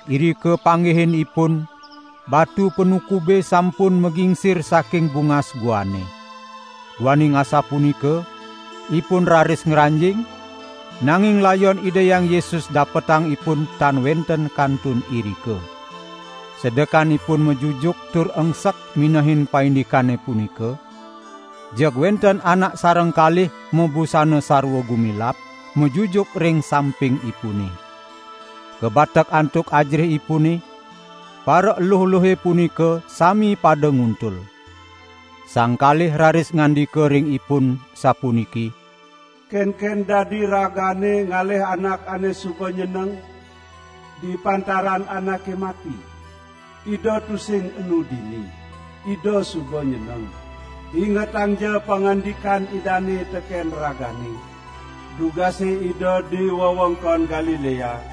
Irika panggihin ipun batu panukube sampun magingsir saking bungas guane. Duaning asapunika ipun raris ngranjing, nanging layon Ida Hyang Yesus dapetang ipun tan wenten kantun irika. Sedekan ipun majujuk tur engsek minehin paindikane punika, jeg wenten anak sareng kalih mabusana sarwa gumilap, majujuk ring sampingipune. Kabatek antuk ajerihipune, paraeluh-eluhe punika sami pada nguntul. Sang kalih raris ngandika ring ipun sapuniki: "Kenken dadi ragane ngalih Anak ane suba nyeneng di pantaran anake mati? Ida tusing enu dini. Ida suba nyeneng. Ingetangja pangandikan Idane teken ragane, dugase Ida di wewengkon Galilea,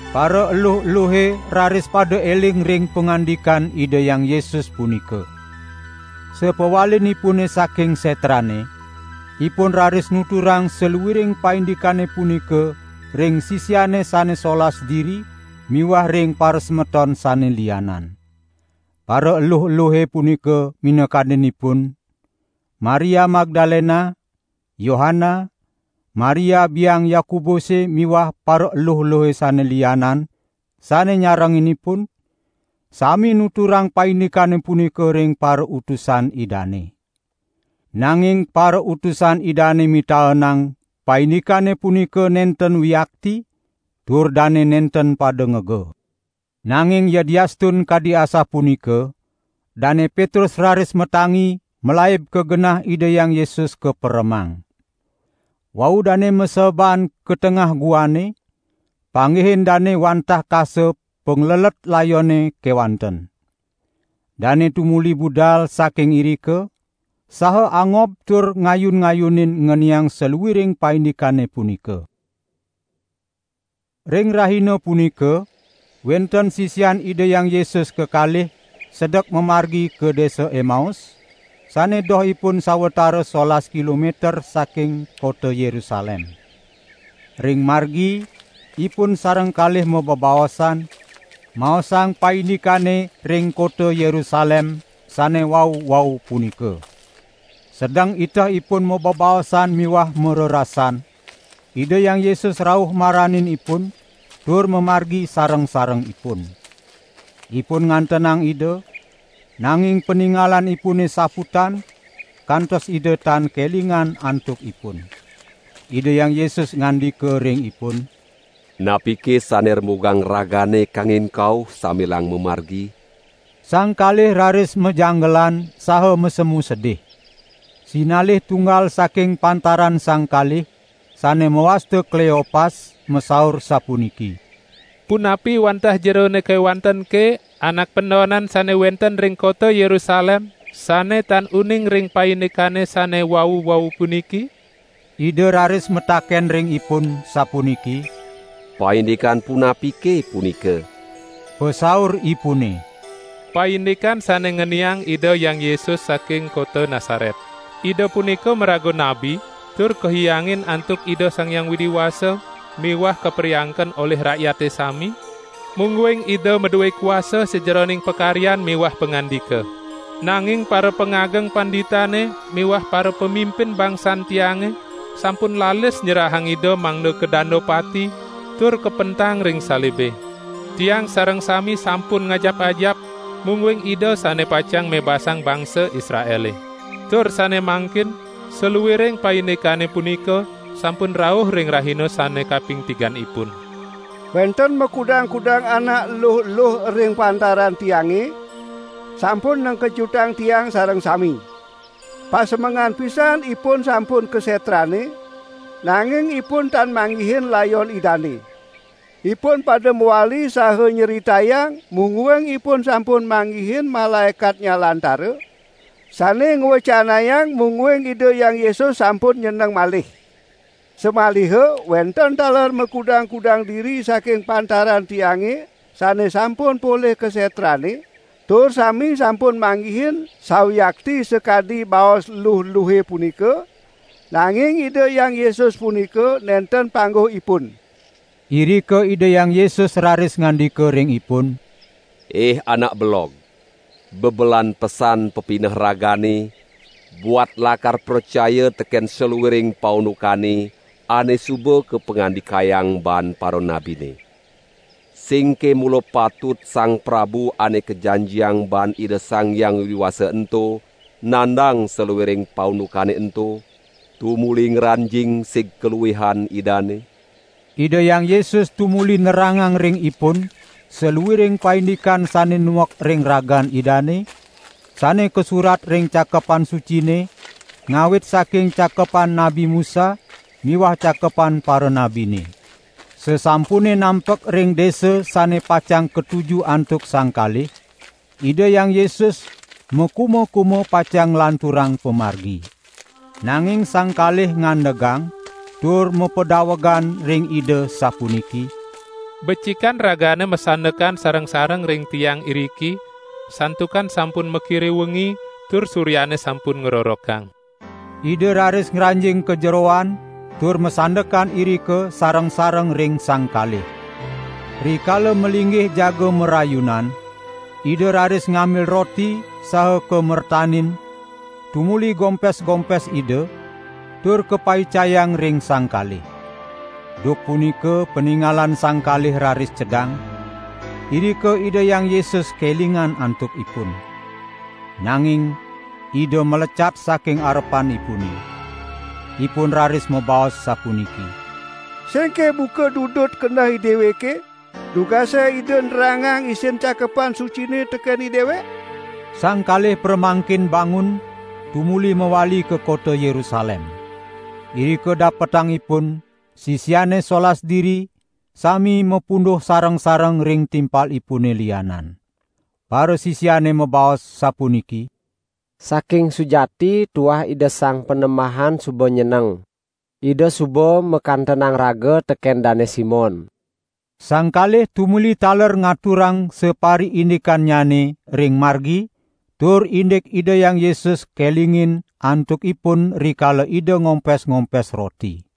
Paraeluh-eluhe raris pada eling ring pangandikan Ida Hyang Yesus punika. Sapawalinipune saking setrane, ipun raris nuturang saluiring paindikane punika ring sisiane sane solas diri miwah ring parasemeton sane lianan. Paraeluh-eluhe punika minakadinipun: Maria Magdalena, Yohana, Maria biang Yakobuse miwah paraeluh-eluhe sane lianan sane nyarengin ipun, sami nuturang paindikane punika ring parautusan Idane. Nanging parautusan Idane mitaenang paindikane punika nenten wiakti tur dane nenten pada ngega. Nanging yadiastun kadi asapunika, Dane Petrus raris matangi malaib ka genah Ida Hyang Yesus kaperemang. Wau dane maseeban ka tengah guane, panggihin dane wantah kasa panglelet layone kewanten. Dane tumuli budal saking irika saha angob tur ngayun-ngayunin ngeniang saluiring paindikane punika. Ring rahina punika wenten sisian Ida Hyang Yesus kekalih sedek mamargi ka desa Emaus, sane dohipun sawatara solas kilometer saking kota Yerusalem. Ring margi ipun sareng kalih mabebaosan, maosang paindikane ring kota Yerusalem sane wau-wau punika. Sedeng iteh ipun mabebaosan miwah marerasan, Ida Hyang Yesus rauh maranin ipun, tur mamargi sareng-sareng ipun. Ipun ngantenang Ida, nanging paningalanipune saputan, kantos Ida tan kelingan antuk ipun. Ida Hyang Yesus ngandika ring ipun: "Napike sane rembugang ragane kangin kauh sambilang mamargi?" Sang kalih raris majanggelan saha masemu sedih. Sinalih tunggal saking pantaran sang kalih, sane mawasta Kleopas, masaur sapuniki: "Punapi wantah Jerone kewantenke Anak pendonan sane wenten ring kota Yerusalem, sane tan uning ring paindikane sane wau-wau puniki?" Ida raris mataken ring ipun, sapuniki: "Paindikan punapike punika?" Pasauripune: "Paindikan sane ngeniang Ida Hyang Yesus saking kota Nasaret. Ida punika maraga nabi tur kahiyangin antuk Ida Sang Hyang Widi Wasa miwah kapariangken olih rakyate sami, mungguing Ida madue kuasa sajeroning pakaryan miwah pangandika. Nanging parapangageng panditane miwah parapamimpin bangsan tiange sampun lalis nyerahang Ida mangda kadanda pati, tur kapentang ring salibe. Tiang sareng sami sampun ngajap-ajap, mungguing Ida sane pacang mebasang bangsa Israele. Tur sane mangkin, saluiring paindikane punika sampun rauh ring rahina sane kaping tiganipun. Wenten makudang-kudang anak eluh-eluh ring pantaran tiange, sampun nengkejutang tiang sareng sami. Pasemengan pisan ipun sampun ka setrane, nanging ipun tan manggihin layon Idane. Ipun pada mawali saha nyritayang mungguing ipun sampun manggihin malaekat nyalantara, sane ngwecanayang mungguing Ida Hyang Yesus sampun nyeneng malih. Samaliha wenten taler makudang-kudang diri saking pantaran tiange sane sampun polih ka setrane, tur sami sampun manggihin sawiakti sakadi baos luh-luhe punika, nanging Ida Hyang Yesus punika nenten pangguh ipun." Irika Ida Hyang Yesus raris ngandika ring ipun: "Ih anak belog, bebelan pesan pepineh ragane, buat lakar pracaya teken saluiring paundukane ane suba kapangandikayang baan paranabine. Singke mula patut Sang Prabu Ane Kajanjiang baan Ida Sang Hyang Widi Wasa ento nandang saluiring paundukane ento, tumuli ngranjing sig kaluihan Idane?" Ida Hyang Yesus tumuli nerangang ring ipun, saluiring paindikane sane nuek ring ragan Idane, sane kasurat ring Cakepan Sucine, ngawit saking Cakepan Nabi Musa miwah Cakepan Paranabine. Sasampune nampek ring desa sane pacang katuju antuk sang kalih, Ida Hyang Yesus makuma-kuma pacang nglanturang pamargi. Nanging sang kalih ngandegang tur mapedawegan ring Ida sapuniki: "Becikan Ragane masandekan sareng-sareng ring tiang iriki, santukan sampun makire wengi tur suryane sampun ngrorokang." Ida raris ngranjing ka jeroan tur masandekan irika sareng-sareng ring sang kalih. Rikala malinggih jaga marayunan, Ida raris ngambil roti saha kamertanin tumuli gompes-gompes Ida, tur kapaicayang ring sang kalih. Duk punika paningalan sang kalih raris cedang, irika Ida Hyang Yesus kelingin antukipun. Nanging Ida malecat saking arepanipune. Ipun raris mabaos sapuniki: "Singke buka dudut keneh ideweke, dugase Ida nerangang isin Cakepan Sucine teken idewek?" Sang kalih pramangkin bangun tumuli mawali ka kota Yerusalem. Irika dapetang ipun sisiane solas diri sami mapunduh sareng-sareng ring timpalipune lianan. Parasisiane mabaos sapuniki: "Saking sujati tuah Ida Sang Panembahan suba nyeneng! Ida suba makantenang Raga teken Dane Simon." Sang kalih tumuli taler ngaturang sapariindikannyane ring margi tur indik Ida Hyang Yesus kelingin antukipun rikala Ida ngompes-ngompes roti.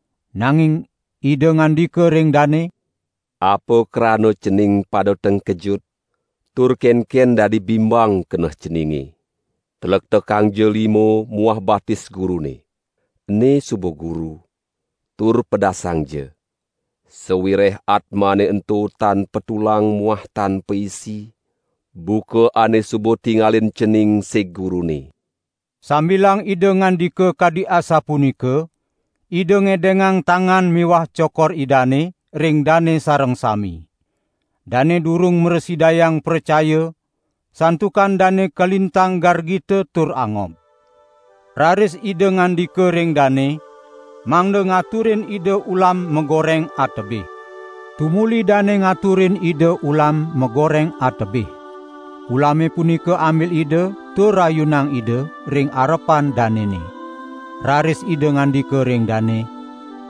Nanging Ida ngandika ring dane: "Apa krana cening pada tengkejut, tur kenken dadi bimbang keneh ceninge? Tlektekangja lima muah batis Gurune. Ene suba Guru, tur pedasangja! Sawireh atmane ento tan patulang muah tan paisi, buka ane suba tingalin cening sig Gurune." Sambilang Ida ngandika kadi asapunika Ida ngedengang tangan miwah cokor Idane ring dane sareng sami. Dane durung mrasidayang pracaya santukan dane kalintang gargita tur angob. Raris Ida ngandika ring dane mangda ngaturin Ida ulam magoreng atebih. Tumuli dane ngaturin Ida ulam magoreng atebih. Ulame punika ambil Ida tur rayunang Ida ring arepan danene. Raris Ida ngandika ring dane: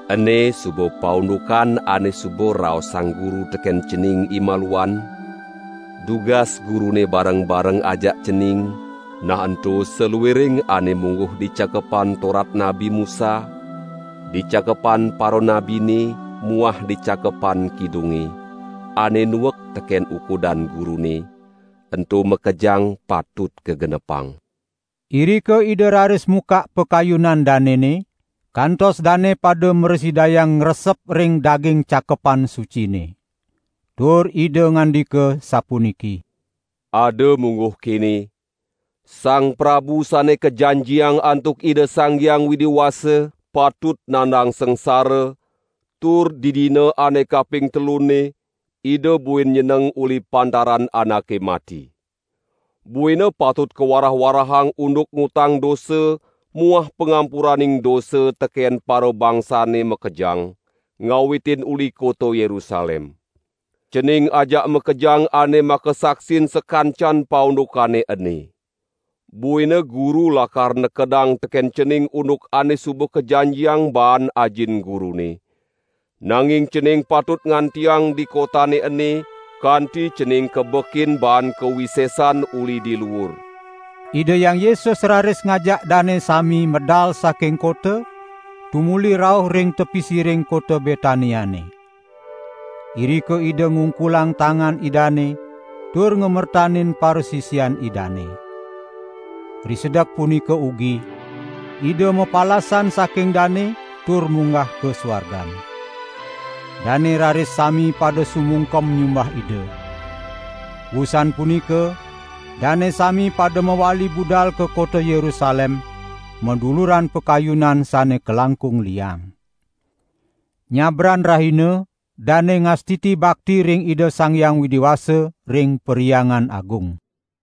"Ene suba paundukan ane suba raosang Guru teken cening imaluan, dugas Gurune bareng-bareng ajak cening, nah ento saluiring ane mungguh di Cakepan Torat Nabi Musa, di Cakepan Paranabine muah di Cakepan Kidunge, ane nuek teken ukudan Gurune, ento makejang patut kagenepang." Irika Ida raris mukak pakayunan danene, kantos dane pada mrasidayang ngresep ring daging Cakepan Sucine. Tur Ida ngandika sapuniki: "Ada mungguh kene: Sang Prabu Utusan Ida Sang Hyang Widi Wasa patut nandang sangsara tur di dina ane kaping telunne Ida buin nyeneng uli pantaran anake mati. Buina patut kawarah-warahang unduk ngutang dosa muah pangampuraning dosa teken parabangsane makejang, ngawitin uli kota Yerusalem. Cening ajak makejang ane makasaksin sakancan paundukane ene. Buina Guru lakar nekedang teken cening unduk ane suba kajanjiang baan Ajin Gurune. Nanging cening patut ngantiang di kotane ene, kanti cening kabekin baan kawisesan uli di luur." Ida Hyang Yesus raris ngajak dane sami medal saking kota, tumuli rauh ring tepi siring kota Betaniane. Irika Ida ngungkulang tangan Idane tur ngamertanin parasisian Idane. Risedek punika ugi, Ida mapalasan saking dane, tur munggah ka suargan. Dane raris sami pada sumungkem nyumbah Ida. Wusan punika dane sami pada mawali budal ka kota Yerusalem maduluran pakayunan sane kalangkung liang. Nyabran rahina dane ngastiti bakti ring Ida Sang Hyang Widi Wasa ring Perhyangan Agung.